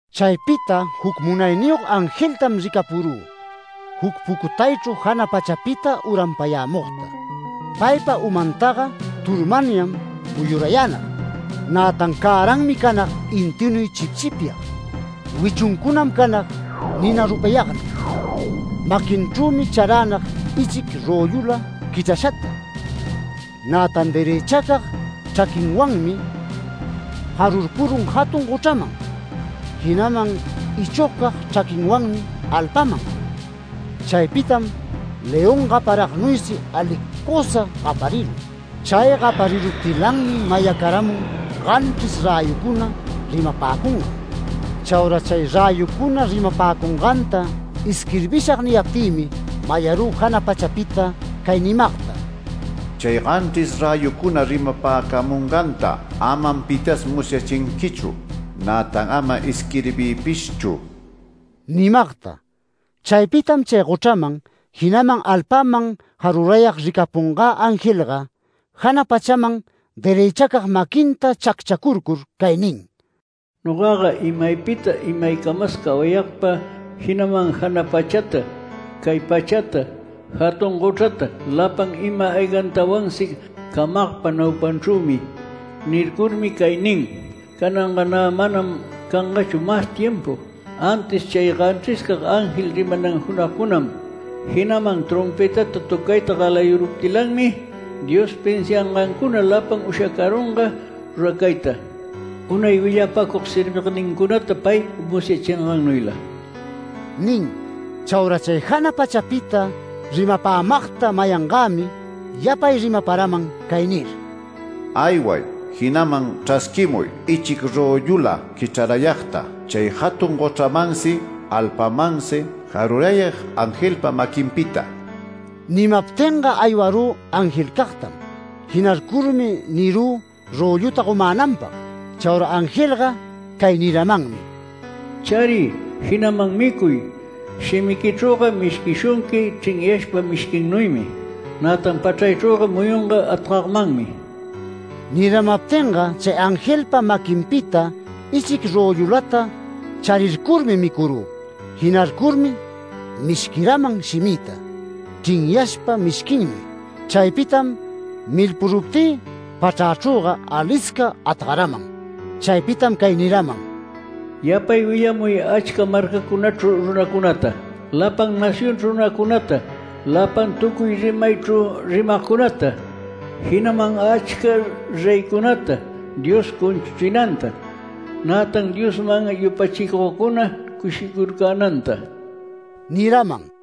Chaypita juc munayniyog angeltam ricapurü, juc pucutaychru jana pachapita uranpayämugta. Paypa umantaga turmanyam muyurayänag, nätan cäranmi canag intinuy chipchipyag, wichuncunam canag nina rupayagnuy. Maquinchrümi charänag ichic röllula quichrashata. Nätan derëchacag chraquinwanmi jarurpurun jatun gochraman, jinaman ichogcag chraquinwanmi alpaman. Chaypitam león gaparagnuysi alicusa gaparirun. Chay gapariruptilanmi mayacaramun ganchris räyucuna rimapäcungan. Chaura “Chay räyucuna rimapäcunganta isquirbishag” niyaptïmi, mayarü jana pachapita cay nimagta: “Chay ganchris räyucuna rimapäcamunganta amam pitas musyachinquichu, nätan ama isquirbiypishchu” nimagta. Chaypitam chay gochraman, jinaman alpaman jarurayag ricapungä angelga jana pachaman derëchacag maquinta chacchacurcur cay nin: “Nogaga imaypita imaycamas cawayagpa, jinaman jana pachata, cay pachata, jatun gochrata lapan ima-aygantawansi camagpa naupanchrümi. Nircurmi cay nin: Cananga nä manam cangachu mas timpu, antis chay ganchriscag ángel rimanan junagcunam, jinaman trompëtata töcayta galayuruptilanmi, Dios pinsiangancuna lapan ushacarunga ruracayta, unay willapacug servignincunata pay musyachingannuyla” nin. Chaura chay jana pachapita rimapämagta mayangämi yapay rimaparaman cay nir: “Ayway, jinaman chrasquimuy ichic röllula quichrarayagta, chay jatun gochramansi alpamansi jarurayag angelpa maquinpita”. Nimaptinga aywarü angelcagtam. Jinarcurmi nirü rölluta gomänanpag. Chaura angelga cay niramanmi: “Chariy, jinaman micuy. Shimiquichrüga mishquishunqui chrinyashpa mishquinuymi, nätan pachraychrüga muyunga atgagmanmi”. Niramaptinga chay angelpa maquinpita ichic röllulata charircurmi micurü. Jinarcurmi mishquiraman shimïta chrinyashpa mishquinnuy. Chaypitam milpuruptï pachrachrüga alisca atgaraman. Chaypitam cay niraman: “Yapay willamuy achca marcacunachru runacunata, lapan nacionchru runacunata, lapan tucuy rimaychru rimagcunata, jinaman achca reycunata Dios cunchuchinanta, nätan Diosman yupachicugcuna cushicurcänanta” niraman.